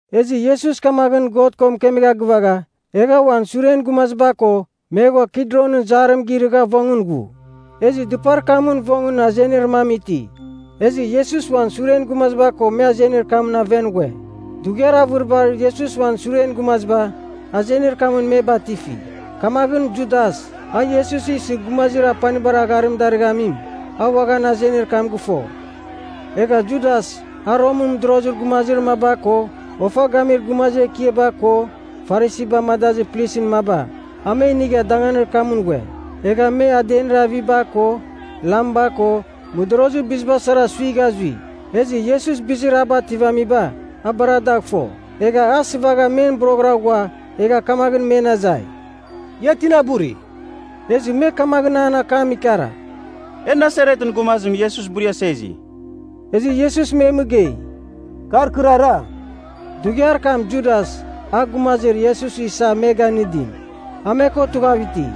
Ezɨ Iesus kamaghɨn God ko mɨkemegha gɨvagha, egha uan suren gumaziba ko me ghua Kidronɨn zarim girɨgha vongɨn ghu. Ezɨ dɨpar kamɨn vongɨn azenir mam iti, ezɨ Iesus uan suren gumaziba ko me azenir kamɨn aven ghue. Dughiar avɨribar Iesus uan suren gumaziba azenir kamɨn me batifi. Kamaghɨn Judas, a Iesus isɨ gumazir apanibar agharim darɨghamim, a uaghan azenir kam gɨfo. Egha Judas, a Romɨn mɨdorozir gumaziba ko, ofa gamir gumazir ekiaba ko Farisiba amadazir plisɨn maba, a me inigha danganir kamɨn ghue. Egha me adenir aviba ko lamba ko mɨdorozir biziba sara suigha zui. Ezɨ Iesus bizir a bativamiba a bar dagh fo. Egha a sɨvagha men boroghɨra ghua egha kamaghɨn me azai, “Ia tina buri?” Ezɨ me kamaghɨn an akam ikara, “E Nasaretɨn gumazim Iesus buriasa izi.” Ezɨ Iesus me mɨgei, “Kar kɨrara.” Dughiar kam Judas, a gumazir Iesus isa me ganɨdim, a me ko tughav iti.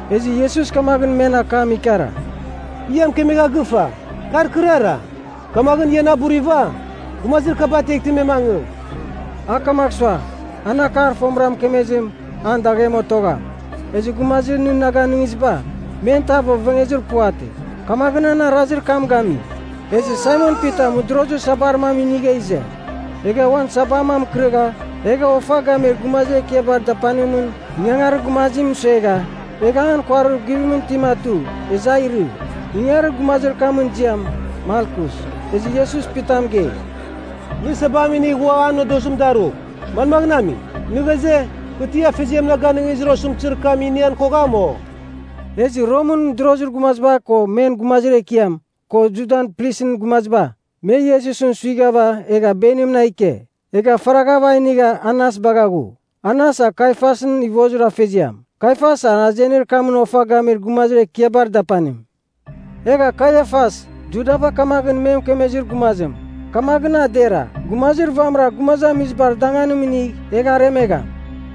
Ezɨ Iesus kamaghɨn men akam ikara, “Kɨ ia mɨkemegha gɨfa, kar kɨrara. Kamaghɨn ia na buriva, gumazir kaba ateghtɨ me mangɨ.” A kamagh sua an akar fomɨra mɨkemezim, an daghem otogham, “Ezɨ gumazir nɨ na ganɨngiziba, men tav ovengezir puvatɨ.” Kamaghɨn an arazir kam gami. Ezɨ Saimon Pita mɨdorozir sabar mam inigha ize, egha uan sabam a mɨkɨrɨgha egha ofa gamir gumazir ekiabar dapanimɨn ingangarir gumazim mɨsuegha, egha an kuarir guvimɨn itim atu, ezɨ a irɨ. Ingangarir gumazir kamɨn ziam, Malkus. Ezɨ Iesus Pita mɨgei, “Nɨ sabam inigh ua an nodozim darugh. Manmagh ami? Nɨ ghaze, kɨ ti Afeziam na ganɨngizir osɨmtɨzir kam inian kogham, o?” Ezɨ Romɨn mɨdorozir gumaziba ko men gumazir ekiam, ko Judan plisɨn gumaziba, me Iesusɨn suighava egha benimɨn a ike. Egha faraghava a inigha Anas bagha ghu. Anas a Kaiafasɨn ivozir afeziam. Kaiafas a azenir kamɨn ofa gamir gumazir ekiabar dapanim. Egha Kaiafas, Judaba kamaghɨn me mɨkemezir gumazim, “Kamaghɨn a dera, gumazir vamɨra gumazamizibar danganim inigh egh aremegham.”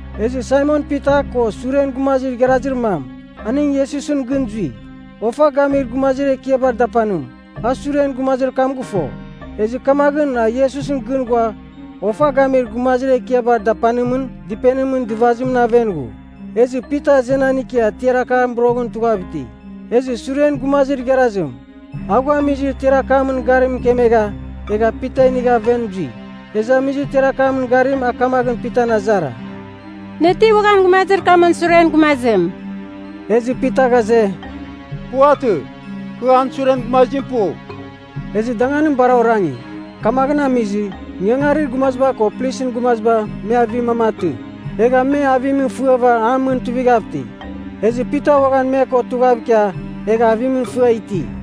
Ezɨ Saimon Pita ko suren gumazir igharazir mam, aning Iesusɨn gɨn zui. Ofa gamir gumazir ekiabar dapanim, a suren gumazir kam gɨfo, ezɨ kamaghɨn a Iesusɨn gɨn ghua ofa gamir gumazir ekiabar dapanimɨn dɨpenimɨn dɨvazimɨn aven ghu. Ezɨ Pita azenan ikia tiar akamɨn boroghɨra tughav iti. Ezɨ suren gumazir igharazim, a ghua amizir tiar akamɨn garim mɨkemegha, egha Pita inigha aven zui. Ezɨ amizir tiar akamɨn garim a kamaghɨn Pitan azara, “Nɨ ti uaghan gumazir kamɨn suren gumazim?” Ezɨ Pita ghaze, “Puvatɨ. Kɨ an suren gumazim pu.” Ezɨ danganim bar orangi. Kamaghɨn amizɨ ingangarir gumaziba ko plisɨn gumaziba me avir mam atɨ. Egha me avimɨn fɨava an mɨn tuivighav iti. Ezɨ Pita uaghan me ko tughav ikia egha avimɨn fɨa iti.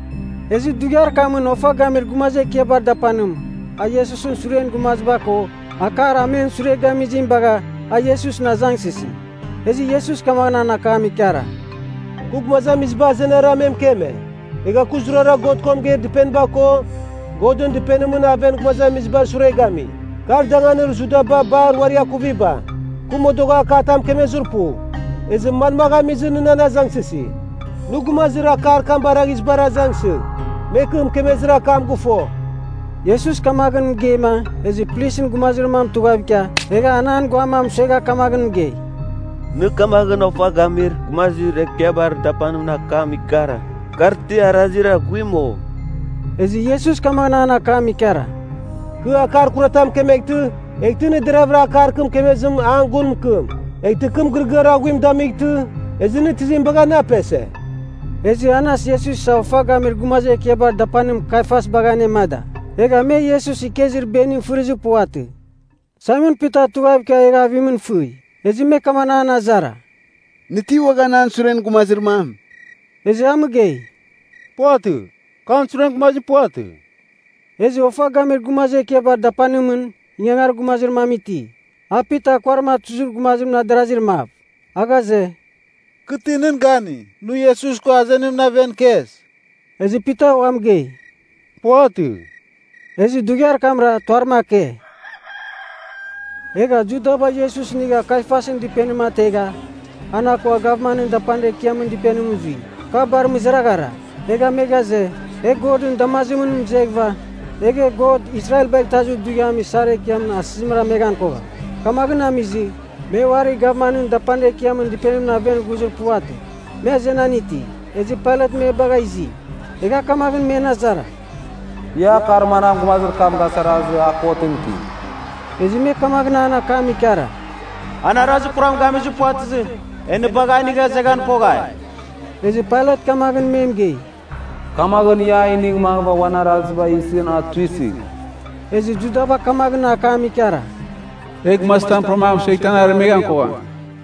Ezɨ dughiar kamɨn ofa gamir gumazir ekiabar dapanim, a Iesusɨn suren gumaziba ko akar a men sure gamizim bagha, a Iesusɨn azangsɨsi. Ezɨ Iesus kamaghɨn an akam ikara, “Kɨ gumazamiziba azenara me mɨkeme. Egha kɨ zurara God ko mɨgeir dɨpeniba ko Godɨn Dɨpenimɨn aven gumazamizibar sure gami. Kar danganir Judaba bar uari akuviba. Kɨ modogha akatam mɨkemezir pu. Ezɨ manmagh amizɨ nɨ nan azangsɨsi? Nɨ gumazir akar kam baraghizibar azangsɨgh. Me kɨ mɨkemezir akam gɨfo.” Iesus kamaghɨn mɨgeima ezɨ plisɨn gumazir mam tughav ikia, egha an an guam a mɨsuegha kamaghɨn mɨgei, “Nɨ kamaghɨn ofa gamir gumazir ekiabar dapanimɨn akam ikara, kar ti arazir aghuim, o?” Ezɨ Iesus kamaghɨn an akam ikara, “Kɨ akar kuratam mɨkemeghtɨ, eghtɨ nɨ deravɨra akar kɨ mɨkemezim an gun mɨkɨm. Eghtɨ kɨ mɨgɨrɨgɨar aghuim damightɨ, ezɨ nɨ tizim bagha na apese?” Ezɨ Anas Iesus isa ofa gamir gumazir ekiabar dapanim Kaiafas bagha anemada. Egha me Iesus ikezir benim fɨrizir puvatɨ. Saimon Pita tughav ikia egha avimɨn fɨi. Ezɨ me kamaghɨn an azara, “Nɨ ti uaghan an suren gumazir mam?” Ezɨ a mɨgei, “Puvatɨ. Kɨ an suren gumazim puvatɨ.” Ezɨ ofa gamir gumazir ekiabar dapanimɨn ingangarir gumazir mam iti, a Pita kuarim atuzir gumazimɨn adarazir mav. A ghaze, “Kɨ ti nɨn gani, nɨ Iesus ko azenimɨn aven ikes?” Ezɨ Pita ua mɨgei, “Puvatɨ.” Ezɨ dughiar kamra tuarim ake. Egha Judaba Iesus inigha Kaiafasɨn dɨpenim ategha an akua gavmanɨn dapanir ekiamɨn dɨpenimɨn zui. Ka bar mɨzaraghara. Egha me ghaze, “E Godɨn damazimɨn mɨzeghɨva, egh e God Israelbagh Itazir Dughiamɨn isar ekiamɨn asɨzim rameghan kogham.” Kamaghɨn amizɨ, me uari gavman dapanir ekiamɨn dɨpenimɨn aven ghuzir puvatɨ. Me azenan iti, ezɨ Pailat me bagha izi, egha kamaghɨn men azara, “Ia akar manam gumazir kam gasarazɨ, a kotɨn iti?” Ezɨ me kamaghɨn an akam ikara, “An arazir kuram gamir puvatɨzɨ, e nɨ bagha a inigha izeghan koghai.” Ezɨ Pailat kamaghɨn me mɨgei, “Kamaghɨn, ia a inigh mangɨva uan Arazibagh isɨn a tuisɨgh.” Ezɨ Judaba kamaghɨn akam ikara, “E gumazir tam puram a mɨsueghtɨ an aremeghan kogham.”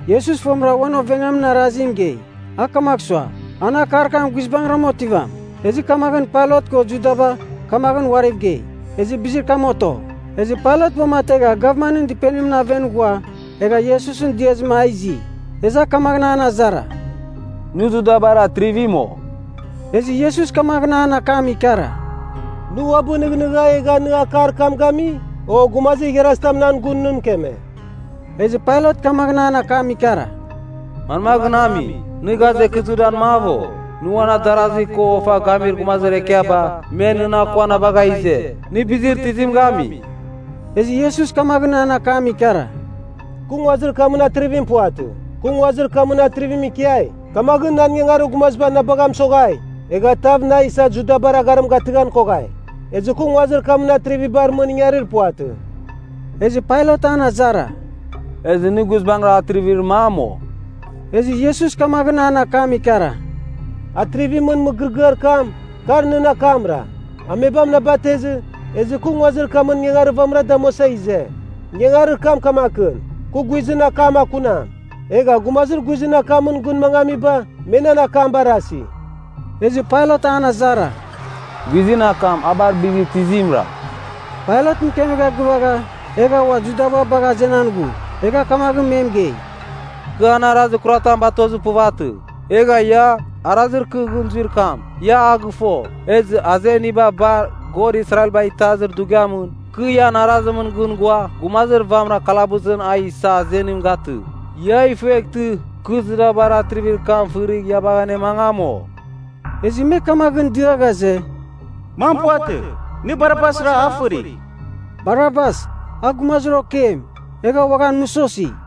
(Iesus fomɨra uan ovengamin arazim mɨgei. A kamagh sua, an akar kam guizbangɨra otivam, ezɨ kamaghɨn Pailat ko Judaba kamaghɨn uariv gei, ezɨ bizir kam oto.) Ezɨ Pailat uamategha gavmanɨn dɨpenimɨn aven ghua, egha Iesusɨn diazɨma a izi. Ezɨ a kamaghɨn an azara, “Nɨ Judabar Atrivim, o?” Ezɨ Iesus kamaghɨn an akam ikara, “Nɨ uabɨ nɨghnɨgha egha nɨ akar kam gami, o gumazir igharazitam nan gun nɨ mɨkeme?” Ezɨ Pailat kamaghɨn an akam ikara, “Manmaghɨn ami? Nɨ ghaze, kɨ Judan mav, o? Nɨ uan adarazi ko ofa gamir gumazir ekiaba, me nɨn akua na bagha ize. Nɨ bizir tizim gami?” Ezɨ Iesus kamaghɨn an akam ikara, “Kɨ nguazir kamɨn atrivim puvatɨ. Kɨ nguazir kamɨn atrivimɨn ikiai, kamaghɨn nan ingangarir gumaziba na bagha mɨsoghai, egha tav na isa Judabar agharim gatɨghan koghai. Ezɨ kɨ nguazir kamɨn atrivibar mɨn ingarir puvatɨ.” Ezɨ Pailat an azara, “Ezɨ nɨ guizbangɨra atrivir mam, o?” Ezɨ Iesus kamaghɨn akam ikara, “Atrivimɨn mɨgɨrɨgɨar kam, kar nɨn akamra. Amebam na batezɨ ezɨ kɨ nguazir kamɨn ingangarir vamɨra damuasa ize. Ingangarir kam kamakɨn: kɨ guizɨn akam akunam. Egha gumazir guizɨn akamɨn gɨn mangamiba, me nan akam barasi.” Ezɨ Pailat an azara, “Guizɨn akam, a bar bizir tizimra?” Pailat mɨkemegha gɨvagha egha ua Judaba bagha azenan ghu. Egha kamaghɨn me mɨgei, “Kɨ an arazir kuratam batozir puvatɨ. Egha ia, arazir kɨ gɨn zuir kam, ia a gɨfo. Ezɨ azeniba bar, God Israelbagh Itazir Dughiamɨn, kɨ ian arazimɨn gɨn ghua gumazir vamɨra kalabusɨn a isa azenim gatɨ. Ia ifueghtɨ kɨ Judabar atrivir kam fɨrigh ia bagh anemangam, o?” Ezɨ me kamaghɨn dɨa ghaze, “Mam puvatɨ! Nɨ Barabasra a fɨrigh!” (Barabas, a gumazir okeim egha uaghan mɨsosi.)